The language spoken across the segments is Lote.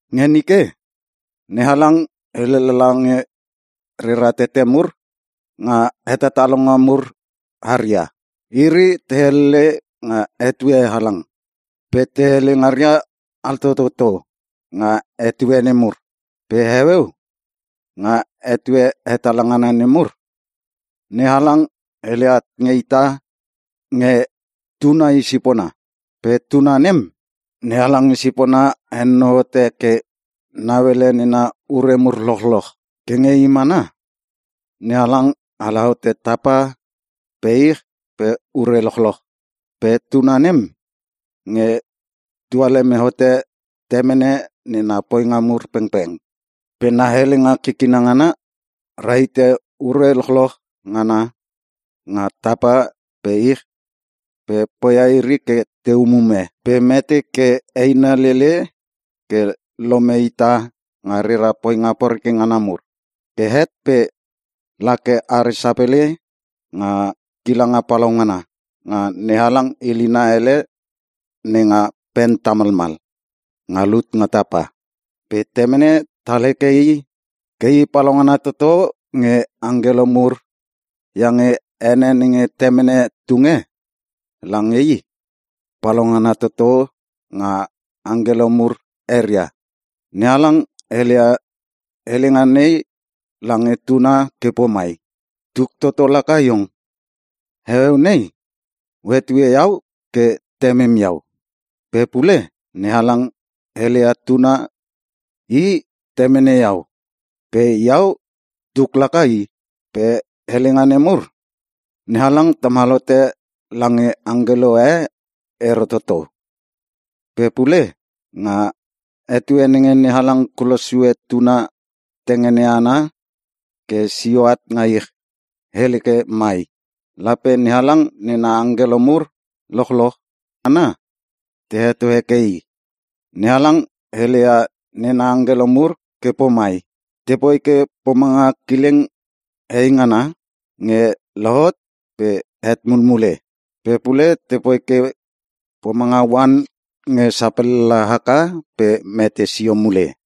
Nge nike, NeHalang hele lala nge rera tete mur nga hetatalonga mur haria. Iri te helele nga etue halang, pe te hele ngaria altototo nga etue nemur. Pe heueu, nga etue hetala ngana nemur, NeHalang hele at at nge ita nge Tuna i sipona. Pe Tuna nem, NeHalang i sipona henonou hote ke nauele nena ure mur lochloch. Ke nge I mana, NeHalang ala hote tapa pe ich pe ure lochloch. Pe Tuna nem nge tualeme hote Temene nena poinga mur pengpeng. Pe na helenga kikina ngana, rahite ure lochloch ngana nga tapa pe ich pe poia iri ke te umume. Pe mete ke eina lele ke lome ita nga rera poinga poreke ngana mur. Ke het pe la ke are sapele nga kilanga palaungana, nga NeHalang ilina ele nenga pen tamalmal nga lut nga tapa. Pe temene tal heke i ke i palaungana toto nge angkelo mur iange ene nenge Temene tunge lange i, palaungana toto nga angkelo mur eria. NeHalang heleia helenga nei lange tuna ke pomai, “Tuk toto laka Iong. Heueu nei O hetue iau ke Temem Iau.” Pe pule, NeHalang heleia tuna ke teke, “I temene iau. Pe iau tuk, laka i.” Pe helenga nemur, NeHalang tamal hote lange angkelo e ero toto. Pe pule nga etue nenge NeHalang kulosia Tuna tengene ana ke sio at nga ich, hele ke mai, “Lape NeHalang nena angkelo mur lochloch ngana te heto heke i.” NeHalang hele ia nena angkelo mur ke pomai, “Te poi ke pomanga kileng heingana nge lohot pe het mulmule. Pe pule tepoi ke pomanga oan nge sapellala haka pe mete sio mule.”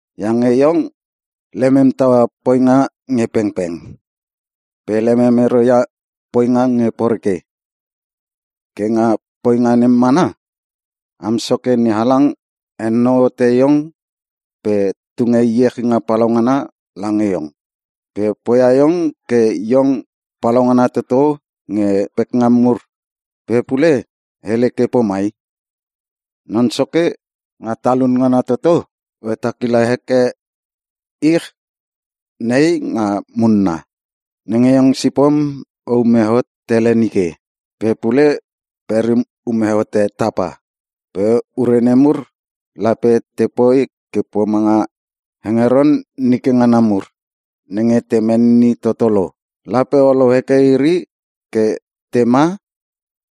Iange iong lemem taua poinga nge pengpeng pe lemem ero ia poinga nge poreke. Ke nga poinga nem mana, Am Soke NeHalang henonou hote iong pe tunge iechinga palaungana lange iong. Pe poia iong ke iong palaungana toto nge pekngam mur.” Pe pule, hele ke pomai, “Non Soke, nga talun ngana toto, O hetakila heke ich nei nga munna nenge iong sipom o ume hot tele nike pe pule perim ume hote tapa. Pe ure nemur lape te poi ke pomanga hengeron nike ngana mur nenge te menini toto lo. Lape olou heke iri ke tema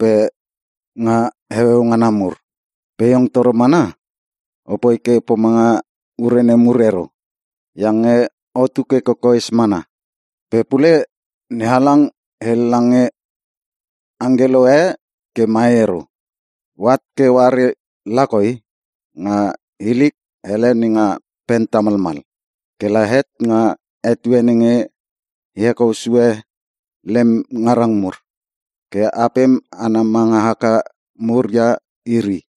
pe o hetaua iri nga heueu ngana mur. Pe iong toro mana opoi ke pomanga ure nemur ero, iange otu ke kokoes mana.” Pe pule NeHalang hele lange angkelo e ke mai ero: “O at ke oare lakoi nga hilik hele nenga pen tamalmal, ke la het nga etue nenge e hekou sue lem ngarang mur ke apem ana manga haka muria iri.”